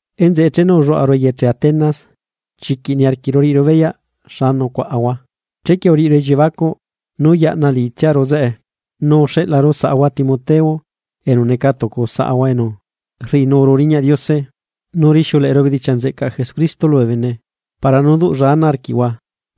Enzeꞌe chenu ulluaꞌaru eyeche Atenas chiquiꞌ niarquiꞌru riꞌiru beyaꞌ xa nucuaꞌahua, chequie uriꞌiru elliebacuꞌ nú yaꞌna liꞌitsiaru zeꞌe. Nu uxeꞌlaru saꞌahua Timoteo enu neca tucu saꞌahua enu rriꞌinuru riñaꞌ Diose nú rixiuleꞌeru bedichiaꞌ nzeꞌcaꞌ Jesucristo lubee bene para nú duꞌlla ana arquiꞌhua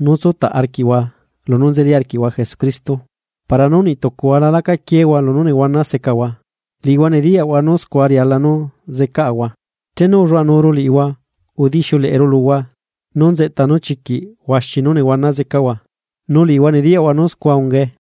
nú tsutaꞌ arquiꞌhua lunú nzelila arquiꞌhua Jesucristo. Para nú niꞌtucuhua la lacaquiehua lunú nehuana secahua, liꞌihua nediyaꞌhua nú scua riala nú zecaꞌahua. Chenu ulluaꞌanuru liꞌihua udixiuleꞌeru luhua nú nzeꞌta nú chiquiꞌ huaxi nú nehuana zecaꞌahua, nu liꞌihua nediyaꞌhua nú scua ungae.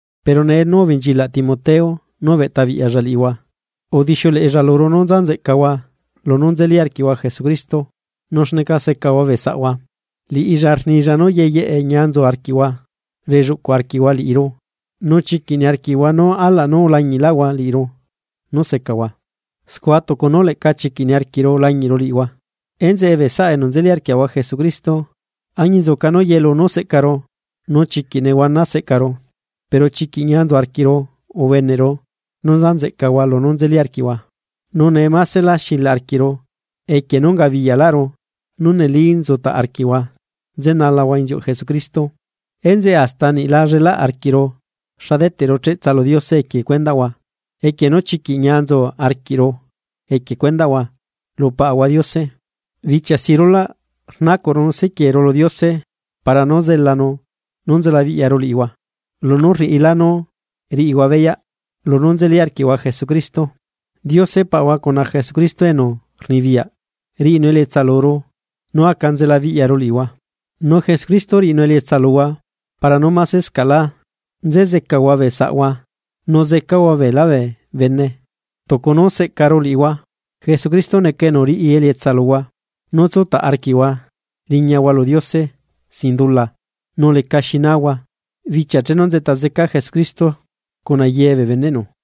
Pero nee nú ubenchilaꞌ Timoteo nú ubeꞌtabiꞌyalla liꞌihua, udixiuleꞌella luru nú nza nzeꞌcahua lunú nzeli arquiꞌhua Jesucristo nu xneca secahua bee saꞌhua. Liꞌilla rnilla nú yeyeꞌe ñia nzu arquiꞌhua relluꞌcuꞌ arquiꞌhua liꞌiru nu chiquiꞌ niarquiꞌhua nú alaꞌ nú ulañiꞌlaꞌhua liꞌiru nú secahua, scua tucu nú leꞌca chiquiꞌ niarquiꞌru lañiꞌru liꞌihua. Enzeꞌe, bee saꞌa enu nzeli arquiaꞌahua Jesucristo añinzuca nú yelu nú seꞌcaru nu chiquiꞌ nehuana seꞌcaru, pero chiquiꞌ ñia nzu arquiꞌru ubeneꞌru nú nza nzeꞌcahua lunú nzeli arquiꞌhua. Nu nee másela xilaꞌ arquiꞌru equie nú ungabiyaꞌlaꞌru nú neli nzutaꞌ arquiꞌhua nzenalahua inziuꞌ Jesucristo. Enzeꞌe hasta niꞌ la llelaꞌ arquiꞌru xa deteꞌru cheꞌtsa lu Diose equie cuendaꞌhua equie nú chiquiꞌ ñia nzu arquiꞌru equie cuendaꞌhua lu Paꞌahua Diose. Bichia si rulaꞌ rnacuꞌru nu sequieru lu Diose para nú zelanu nú nzelabiꞌyaru liꞌihua, nu laꞌxuru niru luhua lunú rriꞌilá nú riꞌihua beyaꞌ lunú nzeli arquiꞌhua Jesucristo. Diose Paꞌahua cuna Jesucristo enu rnibiyaꞌ riꞌinu elietsa luru nú aca nzelabiꞌyaru liꞌihua. Nu Jesucristo riꞌinu elietsa luhua para nú másescaꞌlá nze zecahua bee saꞌhua nu zecahua ye beelá bee bene tucu nú seꞌcaru liꞌihua. Jesucristo neca enu riꞌi elietsa luhua nú tsutaꞌ arquiꞌhua riñahua lu Diose sin dula nu lecaxi nahua, bichia chenu nzeꞌta zeca Jesucristo cuna ye bee beneꞌnu.